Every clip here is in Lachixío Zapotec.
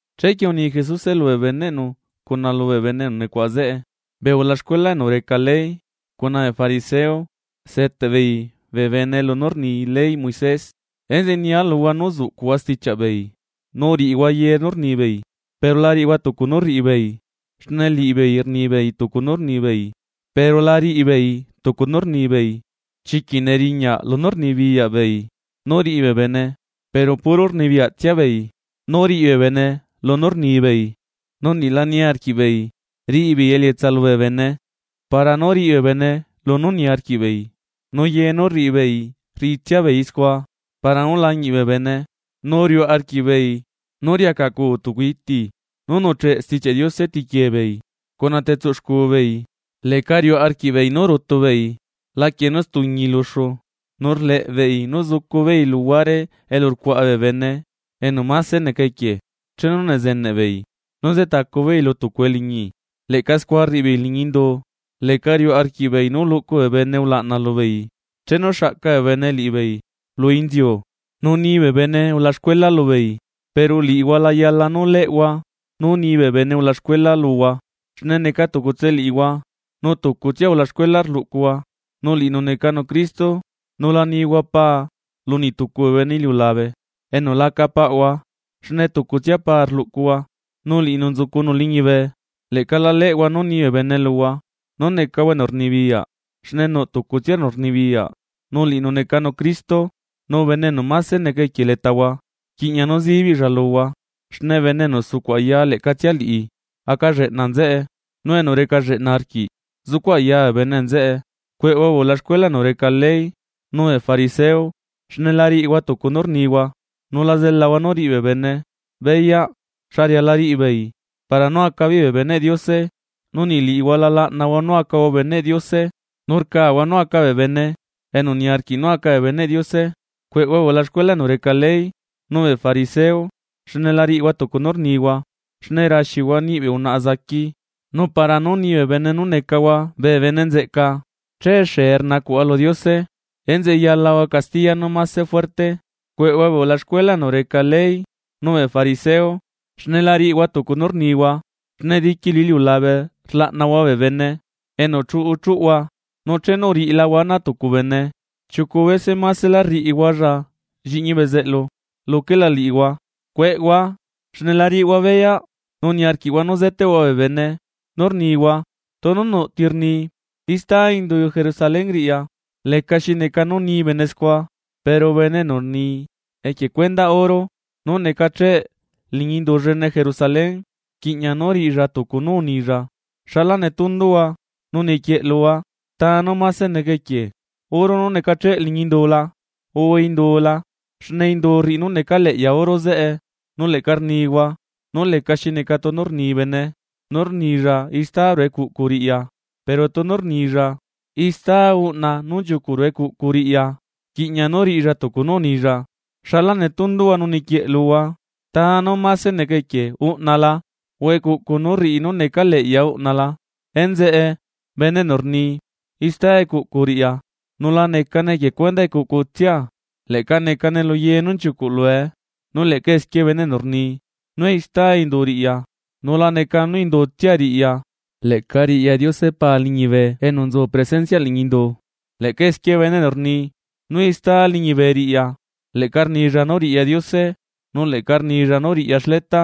Chequie uni Jesuse lubee beneꞌnu cuna lubee bene enu nucuaꞌa zeꞌe: ―Bee ulaxcuela enu reca ley cuna bee fariseo, seteꞌ beei bee bene lunú rni leyꞌ Moisés. Enzeꞌe nia luhua nú uzuꞌcuꞌhua stichiaꞌ beei, nu riꞌihua ye nú rnibeei, pero la riꞌihua tucu nú rriꞌi beei, xne liꞌibeei rnibeei tucu nú rnibeei pero la riꞌibeei tucu nú rnibeei. Chiquiꞌ neriñaꞌ lunú rnibiyaꞌ beei nú riꞌi bee bene, pero puro rnibiyaꞌtsia beei nú riꞌi bee bene lunú rnibeei nu niꞌ la niarquiꞌ beei riꞌi beei elietsaꞌ bee bene para nú riꞌi bee bene lunú niarquiꞌ beei. Nu ye nú rriꞌi beei rriꞌitsia beei scua para nú lañiꞌ bee bene. Nú riuꞌ arquiꞌbeei nú riacaꞌcuu tucu iti nú nuꞌcheꞌ Stichiaꞌ Diose tiquie beei cuna testuꞌ xcu beei. Leꞌca riuꞌ arquiꞌbeei nú rutu beei laquie nú stuñi luxu. Nu rleꞌ beei nú zucu beei luhuare elu rcuaꞌa bee bene enu mase neca equie chenu nezeneꞌ beei nú nzetacu beei lu tucu eliñi, leꞌca scua rriꞌi beei liñi indu, leꞌca riuꞌ arquiꞌbeei nú luꞌcu bee bene ulaꞌna lubeei chenu xaꞌca bee bene liꞌibeei lu inziu, nu ni bee bene ulaxcuela lubeei. ’Pero liꞌihua la yala nú leꞌhua nú ni bee bene ulaxcuela luhua xne neca tucutse liꞌihua nu tucutsia ulaxcuela rluꞌcuhua nu liꞌinu necanu Cristo. Nu la nihua pa lu niꞌtucu bee bene iliulabe enu laca paꞌhua, xne tucutsia Paa rluꞌcuhua, nu liꞌinu nzucunu liñibe. Leꞌca la leꞌhua nú ni bee bene luhua nú necahua enu rnibiyaꞌ, xne nuꞌ tucutsia enu rnibiyaꞌ nu liꞌinu necanu Cristo. Nu bene enu mase neca equie letahua, rquiꞌña nú zibiꞌlla luhua. Xne bene enu sucuꞌ aya leꞌcatsia liꞌi aca lleꞌna nzeꞌe, nu enu reca lleꞌna arquiꞌ zucuꞌ aya bee bene nzeꞌe. ’¡Cueꞌhua bee ulaxcuela enu reca ley nu bee fariseo, xne la riꞌihua tucu nú rnihua!, nu la zelahua nú riꞌi bee bene beyaꞌ xa riala riꞌi beei para nú aca beei bee beneꞌ Diose. Nu niꞌ liꞌihua la laꞌnahua nú acahua beneꞌ Diose, nu rcahua nú aca bee bene enu niarquiꞌ nú aca bee beneꞌ Diose. ’¡Cueꞌhua, bee ulaxcuela enu reca ley nu bee fariseo, xne la riꞌihua tucu nú rnihua!, xne raxihua niꞌi bee unaꞌa zaqui, nu para nú ni bee bene nú necahua bee bene nzeꞌca, che xee rnacuꞌhua lu Diose. Enzeꞌe yalahua castiya nú mase fuerte. ’¡Cueꞌhua bee ulaxcuela enu reca ley nu bee fariseo, xne la riꞌihua tucu nú rnihua! Xne diqui lu iliulabe rlaꞌnahua bee bene enu chuꞌu chuꞌhua, nu chenu uriꞌilahua ana tucu bene, chiucu bese masela rriꞌihualla lliꞌñi bezeꞌlu luquela liꞌihua. ’¡Cueꞌhua, xne la riꞌihua beyaꞌ nu niarquiꞌhua nú zeteꞌhua bee bene!, nu rnihua: “Tunu nuꞌ ti rni istá indu Jerusalén riꞌya, lecaxi neca nú ni bene scua, pero bene enu rni equie cuendaꞌ oro nú necacheꞌ liñi indu llene Jerusalén, rquiꞌña nú riꞌilla tucu nú unilla.” ¡Xala netunduhua nu niquieꞌluhua! ¿Ta nú mase neca equie oro nú necacheꞌ liñi indu la, urre indu la? Xne indu rriꞌi nú necaleꞌya oro zeꞌe. Nu leꞌca rnihua: “Nú lecaxi neca tunu rni bene, nú rnilla istá ruꞌu ecuꞌcu riꞌya, pero tunu rnilla istá uꞌna nú nchiucuꞌ ruꞌu ecuꞌcu riꞌya, rquiꞌña nú riꞌilla tucu nú unilla.” ¡Xala netunduhua nu niquieꞌ luhua! ¿Ta nú máse neca equie uꞌna la?, urre ¿Ecuꞌcu nú rriꞌi nú necaleꞌya uꞌna la? Enzeꞌe bene enu rni ista ecuꞌcu riꞌya, nu la necane equie cuendaꞌ ecuꞌcutsia leꞌca necane luye nú nchiucuꞌ lue. Nu leꞌca esquie bene enu rni nú ista indu riꞌya, nu la necane nú indutsia riꞌya leꞌca riꞌya Diose Paa liñibe enu nzu presenciaꞌ liñi indu. Leꞌca esquie bene enu rni nú istá liñibe riꞌya, leꞌca rnilla nú riꞌya Diose nu leꞌca rnilla nú riꞌya xleta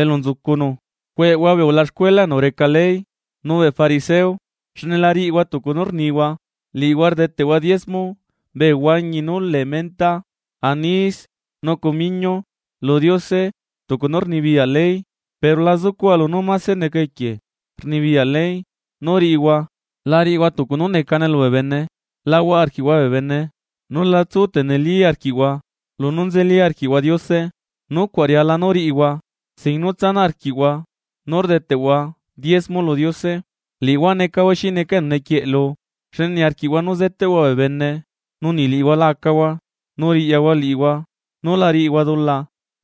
elu nzucunu. ’¡Cueꞌhua bee ulaxcuela enu reca ley, nu bee fariseo, xne la riꞌihua tucu nú rnihua! Liꞌihua rdeteꞌhua diezmo bee huañi nu lee menta, anís nu cumiñu lu Diose tucu nú rnibiyaꞌ ley, pero la zucuꞌhua lunú mase neca equie rnibiyaꞌ ley nú riꞌihua. La riꞌihua tucu nú necane lubee bene, la huaꞌa arquiꞌhua bee bene nu la tsu tenilí arquiꞌhua lunú nzeli arquiꞌhua Diose. Nucuaꞌ riala nú riꞌihua, sin nú tsanaꞌ arquiꞌhua nú rdeteꞌhua diezmo lu Diose. ¡Liꞌihua necahua xi neca enu nequieꞌlu xne niarquiꞌhua nú zeteꞌhua bee bene nu niꞌ liꞌihua la acahua, nu riꞌyahua liꞌihua nú la riꞌihua dula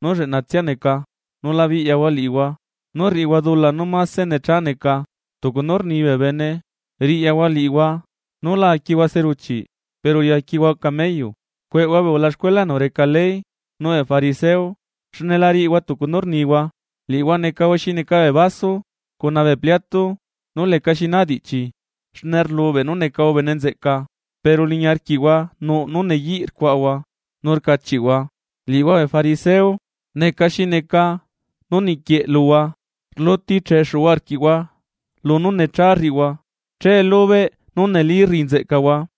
nú lleꞌnatsia neca! ¡Nu la biꞌyahua liꞌihua nú rriꞌihua dula nú mase necha neca! ¡Tucu nú rni bee bene: Riꞌyahua liꞌihua nú la aquihua seruchiꞌ pero riaquihua cameyu! ’¡Cueꞌhua bee ulaxcuela enu reca ley nu bee fariseo, xne la riꞌihua tucu nú rnihua! Liꞌihua necahua xi neca bee vaso cuna bee pliato nú leca xinaa diꞌchi, xne rlubeꞌ nú necahua bene nzeꞌca pero liñi arquiꞌhua nuꞌ nú neyiꞌ rcuaꞌahua nu rcachiꞌhua. Liꞌihua bee fariseo neca xi neca nú niquieꞌluhua: Rluti cheꞌexu arquiꞌhua lunú necha rriꞌihua, che lubeꞌ nú neli rriꞌi nzeꞌcahua.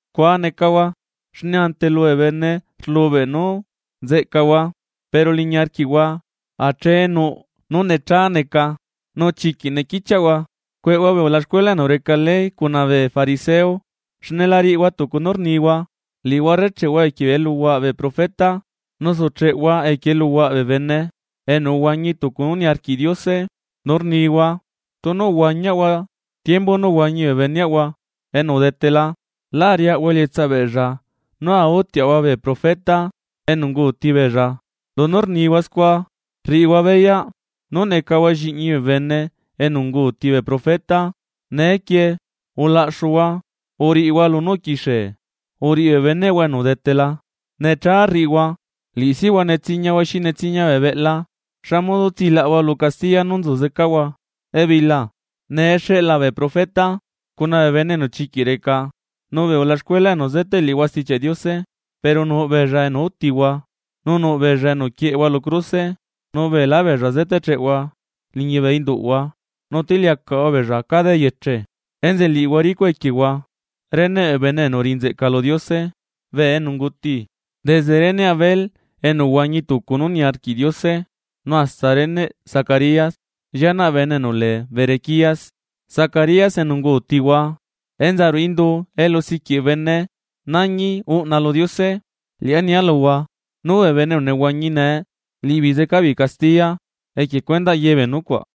Scua necahua, xne ante lubee bene rlubeꞌ nú nzeꞌcahua. Pero liñi arquiꞌhua ache nuꞌ nú necha neca nu chiquiꞌ nequichiaꞌhua. ’¡Cueꞌhua bee ulaxcuela enu reca ley cuna bee fariseo! ¡Xne la riꞌihua tucu nú rnihua! Liꞌihua rrecheꞌhua equie eluhuaꞌ bee profeta nu sucheꞌhua equie eluhuaꞌ bee bene enu uhuañi tucu nú niarquiꞌ Diose, nu rnihua: “Tunu uhuañiaꞌahua tiembu nú uhuañi bee beneꞌahua enu udetela, lá ariaꞌahua elietsaꞌ beella nú autiaꞌahua bee profeta enu unguti beella.” Lunú rnihua scua, rriꞌihua beyaꞌ nú necahua lliꞌñi bee bene enu unguuti bee profeta. ¡Neequie ulaꞌxuhua, uriꞌihua lunú uquixie uriꞌi bee beneꞌhua enu udetela! ’¡Necha rriꞌihua! ¡Liꞌi sihua netsiñahua xi netsiña bee beꞌla! ¿Xa modo tsilaꞌahua lu castiya nú nzu zecahua ebila? Nee xeꞌla bee profeta, cuna bee bene enu chiquiꞌ reca, nu bee ulaxcuela enu zeteꞌ liꞌihua Stichiaꞌ Diose. Pero nuꞌ beella enu utihua nu nuꞌ beella enu quieꞌehua lu cruse, nu beelá beella zeteꞌcheꞌhua liñi bee induꞌhua, nu tiliacaꞌhua beella cada eyeche. Enzeꞌe liꞌihua ricuꞌ equiehua reneꞌ bee bene enu uriꞌi nzeꞌca lu Diose bee enu unguti, desde reneꞌ Abel enu uhuañi tucu nú niarquiꞌ Diose nu hasta reneꞌ Zacarías llianaꞌ bene enu lee Berequías Zacarías enu ungutihua enza ruꞌu indu elu siquiꞌ bene nañi uꞌna lu Diose. Liꞌá nia luhua nú bee bene enu nehuañi nee, liꞌibeei zecabeei castiya equie cuendaꞌ yebee nucuaꞌ.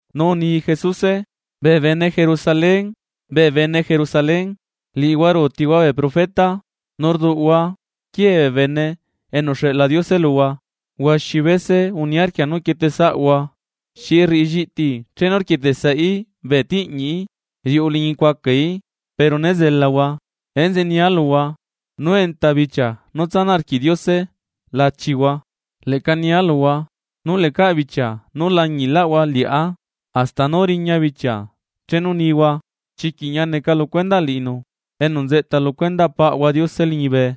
Nu uni Jesuse: ―¡Bee bene Jerusalén, bee bene Jerusalén, liꞌihua ruutihua bee profeta, nu rduꞌhua quiee bee Bene enu uxeꞌla Diose luhua! ¡Huaxi bese uniarquia nú quietesaꞌahua xi rriꞌi lliꞌti chenu rquieteꞌsaí bee tiꞌñiꞌí riuꞌu liñi cuacaí, pero né zelahua! Enzeꞌe nia luhua nú enta bichia nú tsanaꞌ arquiꞌ Diose lachihua. Leꞌca nia luhua nú lecaꞌ bichia nú lañiꞌlaꞌhua liꞌá hasta nú riña bichia chenu nihua: “Chiquiꞌ ñia neca lu cuendaꞌ liꞌinu enu nzeꞌta lu cuendaꞌ Paꞌahua Diose liñibe.”